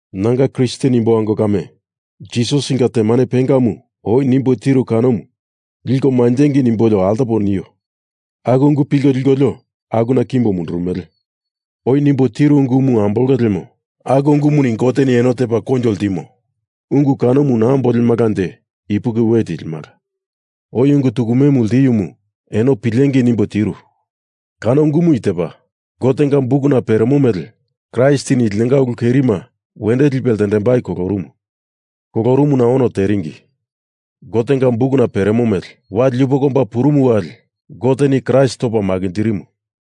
Nanga Kristen imbo ango kame, Jisasinga temane pengamu oi nimbo tiru kanomu liko manjengei nimbolio altopo nio. Aku ungu pilko likolio akuna kimbo mundurumele. Oi nimbo tiru ungumu ambolonge lemo aku ungumuni Goteni eno tepa koinjo ltimo. Ungu kanomu naa ambolemalanje ipuki we tilimala. Oi ungu tukume ltiumu eno pilengei nimbo tiru. Kano ungu i tepa. Gotenga bukuna peremo mele Kraistini linonga ulu kerima wendo lipe ltendembai kolorumu. Kolorumuna ono teringi. Gotenga bukuna peremo mele, wali yupoko omba purumu wali Goteni Kraist topa makinjirimu.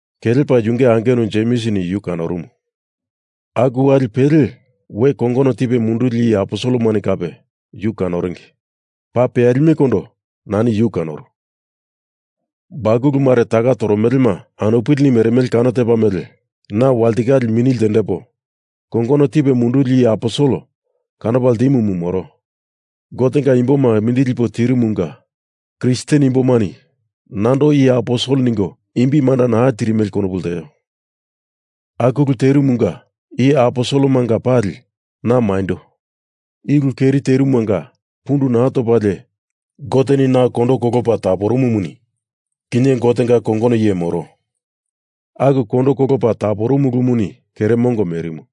Kelepa yunge angenu Jemsini yu kanorumu. Aku wali pele we kongono tipe munduli iye aposelemani kape yu kanoringi. Paa peyalimekondo nani yu kanoru. Bakulu mare taka toromelema anupilini meremele kano tepa mele na walitikale mini ltendepo kongono tipe munduli iye aposel kanopa ltimumu moro. Gotenga imboma mindili lipo tirumunga Kristen imbomani nando iye aposel ningo imbi manda naa tirimele konopu lteo. Aku ulu terumunga iye aposelemanga pali, na maindo. I ulu keri terumanga pundu naa topalie Goteni na kondo kolopa taporumumuni kinye Gotenga kongono iye moro. Aku kondo kolopa taporumu ulumuni kere mongo merimu.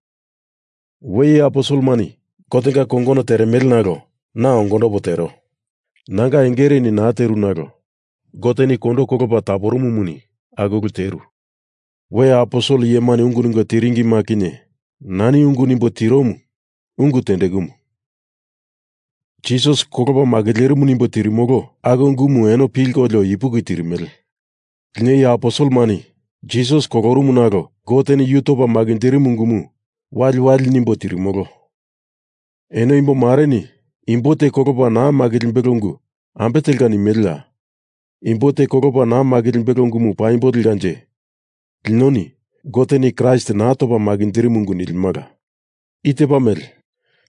We iye aposelemani Gotenga kongono teremele nalo na ongondopo tero. Nanga engereni naa teru nalo Goteni kondo kolopa taporumumuni aku ulu teru. We aposel iyemani ungu ningo tiringima kinye nani ungu nimbo tiromu ungu tendekumu. Jisas kolopa makilerimu nimbo tirimolo aku ungumu eno pilkolio ipuki tirimele. Lino iye aposelemani Jisas kolorumu nalo Goteni yu topa makinjirimu ungumu waliwali nimbo tirimolo. Eno imbomareni imbo te kolopa naa makilimbelo ungu ambe telka nimeleya? Imbo te kolopa naa makilimbelo ungumu paimbo lekanje linoni Goteni Kraist naa topa makinjirimu ungu nilimala. I tepa mele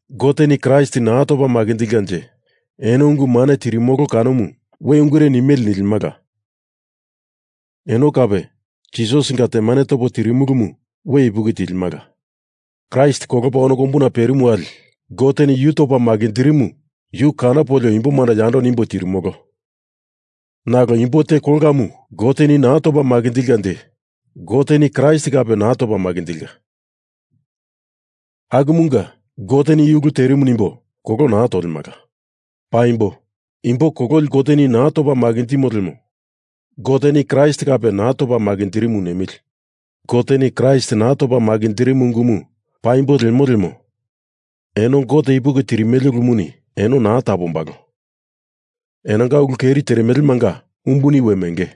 Goteni Kraist naa topa makinjilkanje eno ungu mane tirimolo kanomu we ungure mele nilimala. Eno kape Jisasinga temane topo tirimulumu we ipuki tilimala. Kraist kolopa ono kombuna perimu wali Goteni yu topa makinjirimu yu kanopolio imboma yando nimbo tirimolo. Nalo imbo te kolkamu Goteni naa topa makinjilkanje Goteni Kraist kape naa topa makinjilka. Akumunga Gote i ulumu terimu nimbo kolo tolemala. Paimbo. Imbo kololi Goteni naa topa makinjimo lemo Goteni Kraist kape naa topa makinjirimu nemili. Goteni Kraist naa topa makinjirimu ungumu paimbo lemo lemo eno Gote ipuki tirimele ulumuni eno naa tapombalo. Enonga ulu keri teremelemanga umbuni we menge.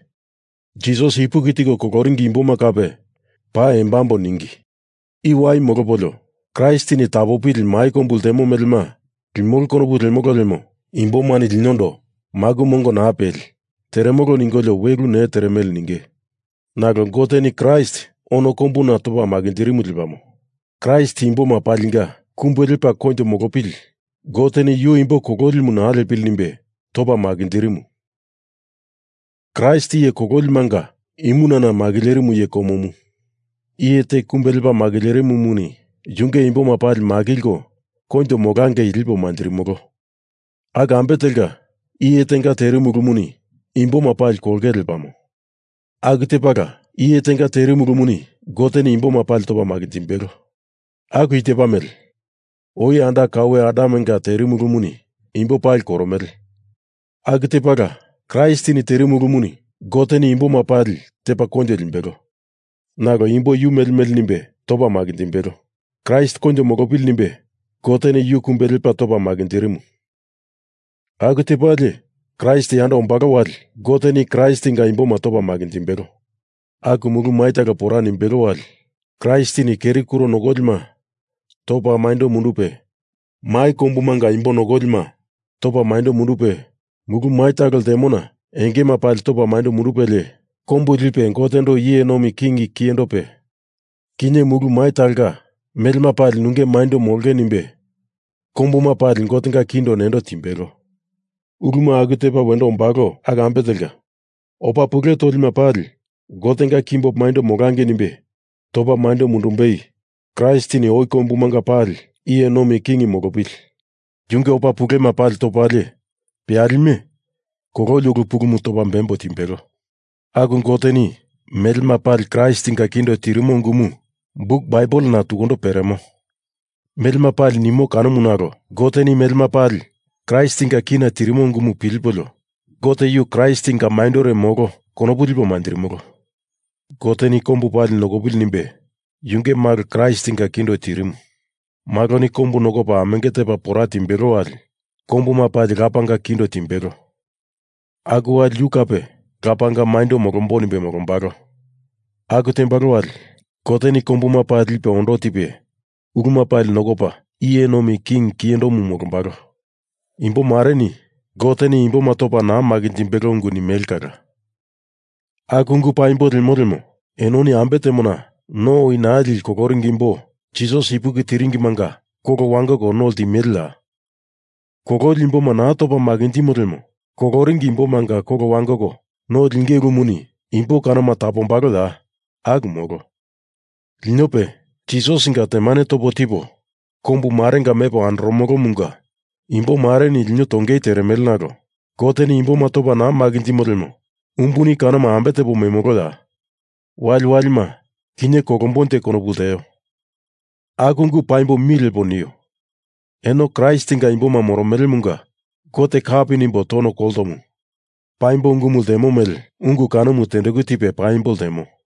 Jisas ipuki tiko koloringi imboma kape paa embambo ningi. I wai molopolio Kraistini tapopili mai kombu ltemo melema limolo konopu lemolo lemo imbomani linondo maku mongo naa peli, teremolo ningolio we ulu ne teremele ninge. Nalo Goteni Kraist ono kombuna topa makinjirimu lepamo. Kraist imboma palinga kumbe lepa koinjo molopili Goteni yu imbo kolilimu naa lepili nimbe topa makinjirimu. Kraist iye kololimanga imunana makilerimu iye komomu. Iye te kumbe lepa makilerimumuni yunge imboma pali makilko koinjo molangei lipo manjirimolo. Aku ambe telka iye tenga terimu ulumuni imboma pali kolongei lepamo. Aku tepala iye tenga terimu ulumuni Goteni imboma pali topa makinjimbelo. Aku i tepa mele. Oi anda kaue Adamenga terimu ulumuni imbo pali koromele. Aku tepala Kraistini terimu ulumuni Goteni imboma pali tepa koinjo limbelo. Nalo imbo yu mele mele nimbe topa makinjimbelo. Kraist koinjo molopili nimbe Goteni yu kumbe lepa topa makinjirimu. Aku tepalie, Kraist yando ombalo wali Goteni Kraistinga imboma topa makinjimbelo. Aku mulu mai talo pora nimbelo wali Kraistini keri kuro nokolima topa maindo mundupe mai kombumanga imbo nokolima topa maindo mundupe mulu mai talo ltemona engema pali topa maindo mundupelie kombu lipe Gotendo iye nomi king kiyendope, kinye mulu mai talonga melema pali nunge maindo molonge nimbe kombuma pali Gotenga kindo nendo timbelo. Uluma aku tepa wendo ombalo aku ambe telka, opa pule tolima pali Gotenga kimbo maindo molangei nimbe topa maindo mundumbei Kraistini oi kombumanga pali iye nomi king molopili. Yunge opa pulema pali topalie peyalime kololi ulu pulumu topa bembo timbelo. Aku Goteni melema pali Kraistinga kindo tirimo ungumu buk Baibelena tukundo peremo. Melema pali nimo kanomu nalo Goteni melema pali Kraistinga kina tirimo ungumu pilipolio Gote yu Kraistinga maindore, molo, konopu lipo manjirimolo. Goteni kombu pali nokopili nimbe Yunge Malo Kraistinga kindo tirimu. Maloni kombu nokopa amenge tepa pora timbelo wali kombuma pali Lapanga kindo timbelo. Aku wali yu kape Lapanga maindo molombo nimbe molombalo. Aku tembalo wali Goteni kombuma pali lipe undotipe uluma pali nokopa iye nomi king kiyendomu molombalo. Imbomareni Goteni imboma topa naa makinjimbelo ungu nimele kala. Aku ungu paimbo lemo lemo enoni ambe temona no oi naa lili koloringi imbo Jisas ipuki tiringimanga kolo wangoko no ltimeleya? Kololi imboma naa topa makinjimo lemo koloringi imbomanga kolo wangoko no liengei ulumuni imbo kanoma tapombaloya? Aku molo. Linope, Jisasinga temane topo tipo kombu marenga mepo andoromolomunga imbomareni lino tongei teremele nalo Goteni imboma topa naa makinjimo lemo umbuni kanoma ambe tepo memoloya? Waliwalima, kinye kolombonje konopu lteo. Aku ungu paimbo mi lepo nio. Eno Kraistinga imboma moromelemunga Gote kapi nimbo tono koltomu, paimbo ungumu ltemo mele ungu kanomu tendeku tipe paimbo ltemo.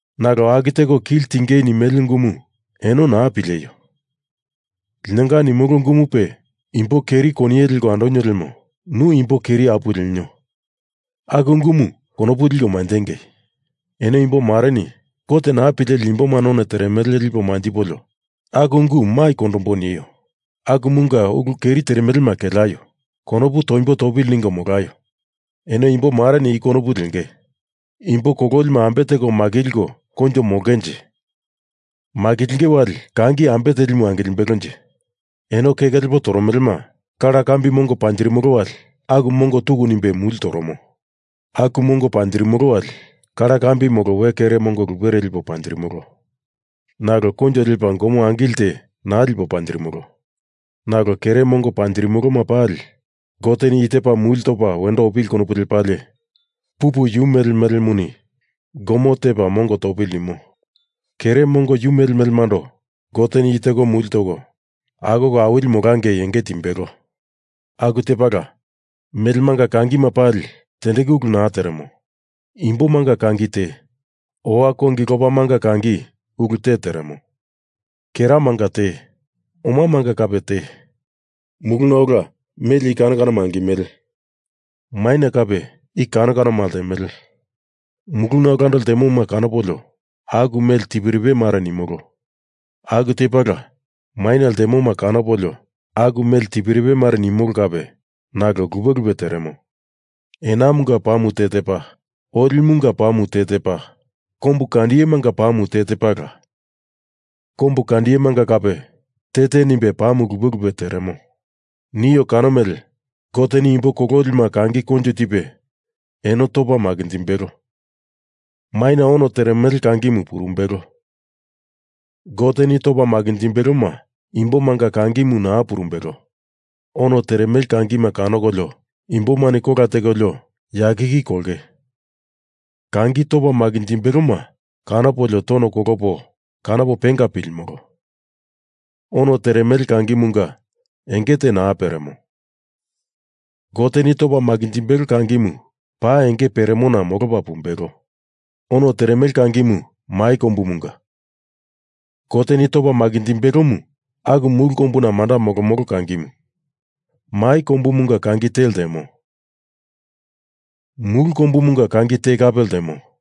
Nalo aku teko kili tingei nimele ungumu eno naa pileio. Linonga nimolo ungumupe imbo keri koniye leko andonio lemo nu imbo keri apuwe lenio aku ungumu konopu liko manjengei. Eno imbomareni Gote naa pileli imboma none teremele lipo manjipolio aku ungu mai kondomboi nio. Akumunga ulu keri teremelema keleaio. Konopu toimbo topili ningo molaio. Eno imbomareni i konopu lengei. Imbo kololima ambe teko makilko koinjo molongenje? Makilinge wali kangi ambe telimu angilimbelonje? Eno keke lepo toromelema. Kalakambi mongo panjirimolo wali aku mongo tuku nimbe muli toromo. Aku mongo panjirimolo wali, kalakambi molo we kere mongo lupere lipolio panjirimolo. Nalo koinjo lepa gomo angili te naa lipo panjirimolo. Nalo kere mongo panjirimoloma pali Goteni i tepa muli topa wendo opili konopu lepalie pupu yu mele melemuni gomo tepa mongo topili nimo. Kere mongo yu mele melemando Goteni i teko muli toko akoko awili molangei enge timbelo. Aku tepala, melemanga kangima pali tendeku ulu naa teremo. Imbomanga kangi te. Owa kongi lopamanga kangi ulu te teremo. Keremanga te. Omamanga kape te. Muluna ola mele i kano kanoma angimele. Maina kape i kano kanoma ltemele. Muluna olando ltemoma kanopolio aku mele tiperipe mare nimolo. Aku tepala maina ltemoma kanopolio aku mele tiperipe mare nimolo kape nalo lupe lupe teremo. Enamunga pamu te tepa. Olimunga pamu te tepa. Kombu kandiyemanga pamu te tepala. Kombu kandiyemanga kape te te nimbe pa lupe lupe teremo. Nio kano mele Goteni imbo kololima kangi koinjo tipe eno topa makinjimbelo. Maina ono teremele kangimu purumbelo. Goteni topa makinjimbeloma imbomanga kangimu naa purumbelo. Ono teremele kangima kanokolio imbomani kola tekolio yakiki kolonge. Kangi topa makinjimbeloma kanopolio tono kolopo kanopo penga pilimolo. Ono teremele kangimunga enge te naa peremo. Goteni topa makinjimbelo kangimu paa enge peremona molopa pumbelo. Ono teremele kangimu mai kombumunga. Goteni topa makinjimbelomu aku mulu kombuna manda molomolo kangimu. Mai kombumunga kangi te ltemo. Mulu kombumunga kangi te kape ltemo.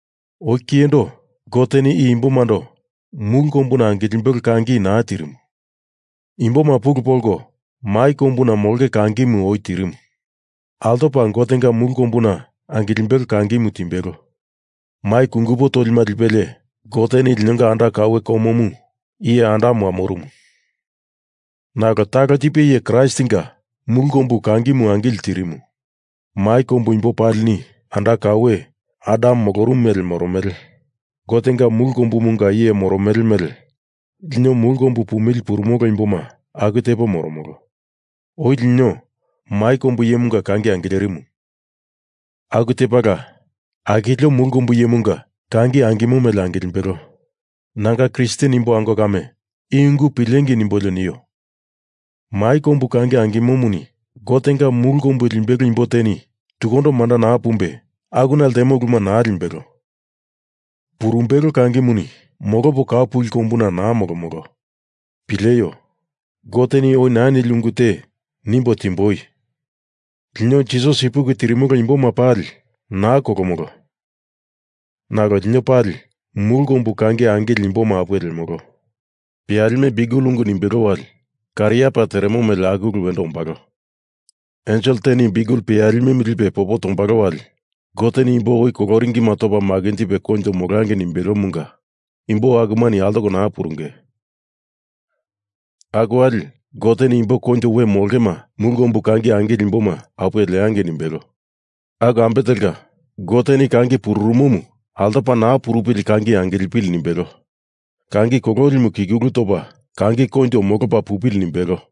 Oi kiyendo Goteni i imbomando mulu kombuna angilimbelo kangi naa tirimu. Imboma pulu polko mai kombuna molonge kangimu oi tirimo. Altopa Gotenga mulu kombuna angilimbelo kangimu timbelo. Mai kungupo tolima lipelie Goteni linonga anda kaue komomu iye Adam wamorumu. Nalo talo tipe iye Kraistinga mulu kombu kangimu angili tirimu. Mai kombu imbo palini anda kaue Adam molorumu mele moromele. Gotenga mulu kombumunga iye moromo mele lino mulu kombu pumili purumolo imboma aku tepo moromolo. Oi lino mai kombu iyemunga kangi angilerimu. Aku tepala akilio mulu kombu iyemunga kangi angimo mele angilimbelo. Nanga Kristen imbo ango kame, i ungu pilengei nimbolio nio. Mai kombu kangi angimomuni Gotenga mulu kombu limbelo imbo teni tukundo manda naa pumbe akuna ltemo uluma naa limbelo. Purumbelo kangimuni molopo kau puli kombuna naa molomolo. Pileio. Goteni oi naa nili ungu te nimbo timboi. Lino Jisas ipuki tirimolo imboma pali naa kolomolo nalo lino pali mulu kombu kangi angili imboma apuwe lemolo. Peyalime biukel ungu nimbelo wali kariapa teremo mele aku ulu wendo ombalo. Ensel teni biukel peyalimemu lipe popo tombalo wali Goteni imbo oi koloringima topa makinjipe koinjo molangei nimbelomunga imbo akumani altoko naa purunge. Aku wali Goteni imbo koinjo we molongema mulu kombu kangi angili imboma apuwe ltendangei nimbelo. Aku ambe telka, Goteni kangi pururumomu altopa naa purupili kangi angilipili nimbelo. Kangi kololimu kikulu topa kangi koinjo molopa pupili nimbelo.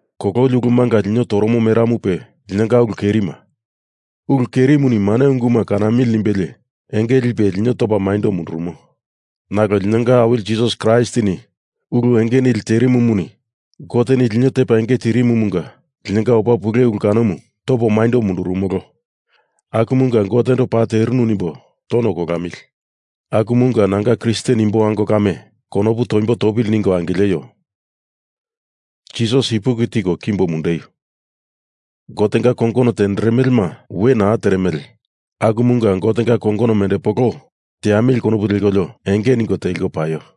Kololi ulumunga lino toromo meramupe linonga ulu kerima. Ulu kerimuni mane unguma kanamili nimbelie enge lipe lino topa maindo mundurumo. Nalo linonga Awili Jisas Kraistini ulu enge nili terimumuni Goteni lino tepa enge tirimumunga linonga opa pule ulu kanomu topa maindo mundurumolo. Akumunga Gotendo paa terimu nimbo tono kolamili. Akumunga nanga Kristen imbo ango kame konopu toimbo topili ningo angileio. Jisas ipuki tiko kimbo mundeio. Gotenga kongono tenderemelema were naa teremele akumunga Gotenga kongonomu mendepolo teamili konopu lekolio enge ningo teliko paio.